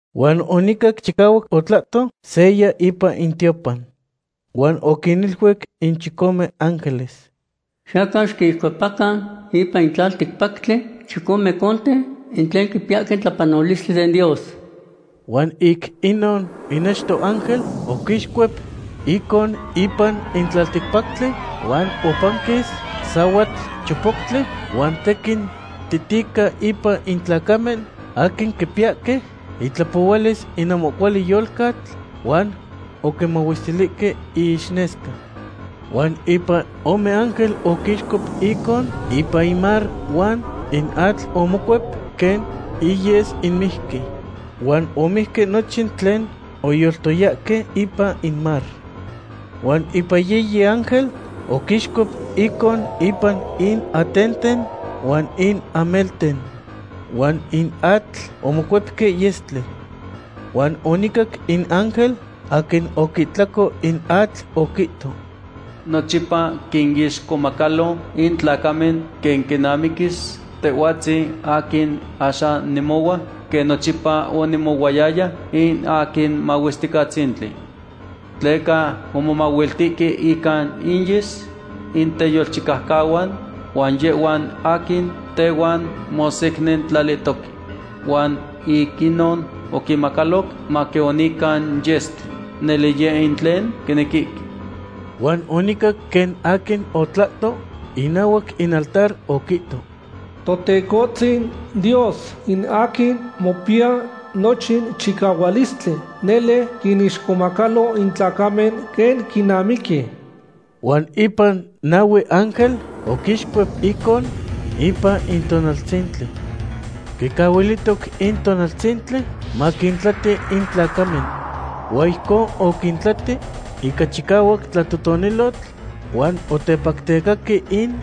Huan onicac chicahuac otlahto seya ipan in tiopan. Huan oquiniluic in chicome ángeles: ―Xiyacan xiquixcuepacan ipan in tlalticpactli in chicome conten in tlen quipiyahque in tlapanolistli den Dios. Huan ic inon in achto ángel oquixcuep icon ipan in tlalticpactli huan opanquis sahuatl chopoctli, huan tequin titica ipan in tlacamen aquin quipiyahque itlapohualis in ahmo cuali yolcatl huan oquimahuestilihque iixnesca. Huan ipan ome ángel oquixcuep icon ipan in mar huan in atl omocuep quen iyes in mijqui. Huan omijque nochin tlen oyoltoyahque ipan in mar. Huan ipan yiyi ángel oquixcuep icon ipan in atenten huan in amelten. Huan in atl omocuepque yestli. Huan onicac in ángel aquin oquihtlaco in atl oquihto: ―Nochipa quinixcomacalo in tlacamen quen quinamiquis, Tehhuatzin aquin axan nemohua quen nochipa onemohuayaya, in aquin Mahuesticatzintli. Tleca omomahuiltihque ica inyes in teyolchicaucahuan huan yehhuan aquin tehuan mosecnintlalihtoque. Huan ic inon oquinmacaloc maquionican yestli. ¡Nele yeh in tlen quinequihque! Huan onicac quen aquin otlahto inahuac in altar oquihto: ―Totecohtzin Dios, in aquin mopiya nochin chicahualistli, nele quinixcomacalo in tlacamen quen quinamiqui. Huan ipan nahue ángel oquixcuep icon ipan in tonaltzintli. Quicahuilihtoc in tonaltzintli maquintlati in tlacamen. Huan ijcon oquintlati ica chicahuac tlatotonilotl, huan otepactecahque in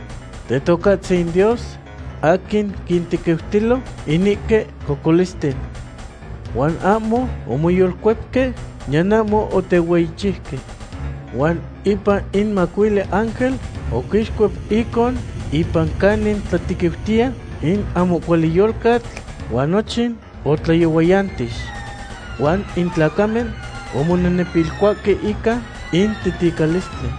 Tetocahtzin Dios aquin quintequiutilo inihque cocolisten. Huan ahmo omoyolcuepque niyan ahmo otehueyichiuque. Huan ipan in macuili ángel oquixcuep icon ipan canin tlatequiutiya in ahmo cuali yolcatl, huan nochin otlayohuayantix. Huan in tlacamen omonenepilcuahque ica in titicalistli.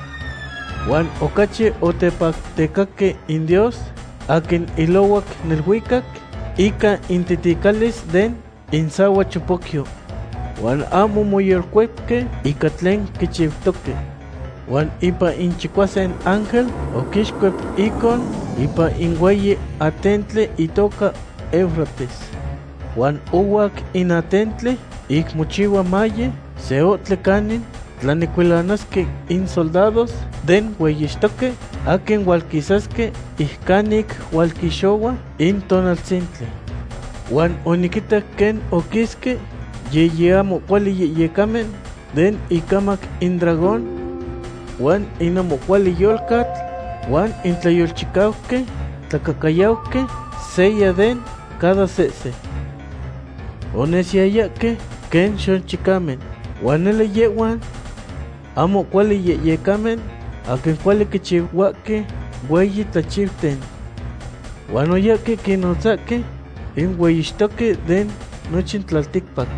Huan ocachi otepactecaque in Dios aquin ilohuac neluicac ica intiticalis den insahuachopocyo. Huan ahmo omoyolcuepque ica tlen quichiutoque. Huan ipan in chicuasin ángel oquixcuep icon ipan in hueyi atentli itoca Eufrates. Huan ohuac in atentli, ic mochihua maye se ohtli canin tlanecuilanasque in soldados den hueyixtoque aquin hualquisasque ic canic hualquixohua in tonaltzintli. Huan oniquitac quen oquisque yiyi ahmo cuali yehyecamen den incamac in dragón, huan in ahmo cuali yolcatl, huan in tlayolchicauqui tlacahcayauqui, seya de cada sehse. Onesiyayahque quen xochicamen. Huan nele yehhuan ahmo cuali yehyecamen aquin cuali quichihuahque hueyi tlachiuten. Huan oyahque quinnotzahque in hueyixtoque den nochin tlalticpac.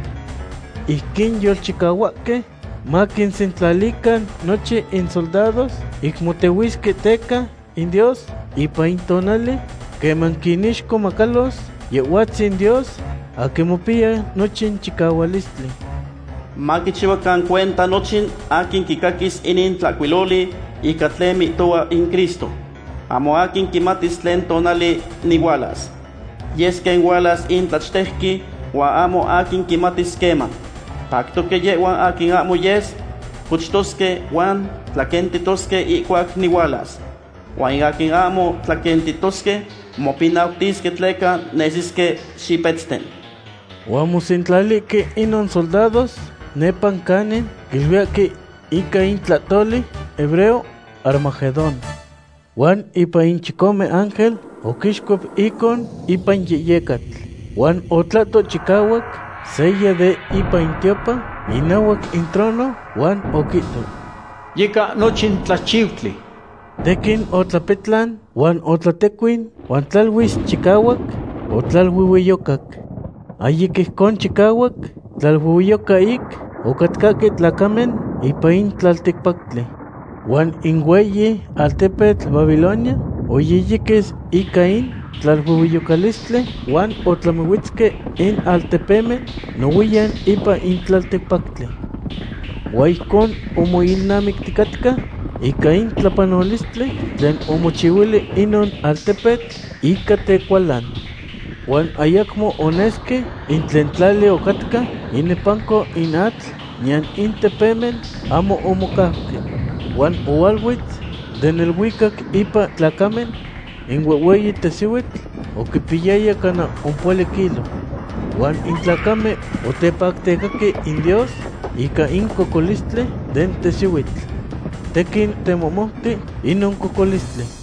Ijquin yolchicahuahque maquinsentlalican nochin insoldados ic motehuisque teca in Dios ipan in tonali queman quinixcomacalos Yehhuatzin Dios aquin mopiya nochin chicahualistli. Maquichihuacan cuenta nochin aquin quicaquis inin tlahcuiloli ica tlen mihtohua in Cristo: “Ahmo aquin quimatis tlen tonali nihualas. Yes quen hualas in tlachtejqui huan ahmo aquin quimatis queman. Pactoque yehhuan aquin ahmo yes cochtosque huan tlaquentitosque ihcuac nihualas. Huan in aquin ahmo tlaquentitosque mopinautisque tleca nesisque xipetzten.” Huan omosentlalihque inon soldados nepa canin quiluiyahque ica in tlahtoli hebreo, Armagedón. Huan ipan in chicome ángel oquixcuep icon ipan yehyecatl. Huan otlahto chicahuac seya de ipan in tiopan, inahuac in trono, huan oquihto: ―Yica nochin tlachiutli. Tequin otlapetlan, huan otlatehtecuin, huan tlaluis chicahuac otlaluehueyocac. Ahyic ijcon chicahuac tlaluehueyoca ic ocatcahque tlacamen ipan in tlalticpactli. Huan in hueyi altepetl Babilonia oyiyiquis ica in tlaluehueyocalistli huan otlamihuetzque in altepemen nohuiyan ipan in tlalticpactli. Huan ijcon omoilnamicticatca ica in tlapanolistli tlen omochihuili inon altepetl ica tecualan. Huan ayacmo onesque in tlen tlali ocatca inepanco in atl, niyan in tepemen ahmo omocauque. Huan ohualuetz den neluicac ipan tlacamen in huehhueyi tesihuitl oquipiyaya cana ompohuali kilo. Huan in tlacamen otepactecaque in Dios ica in cocolistli den tesihuitl. Tequin temohmouti inon cocolistli.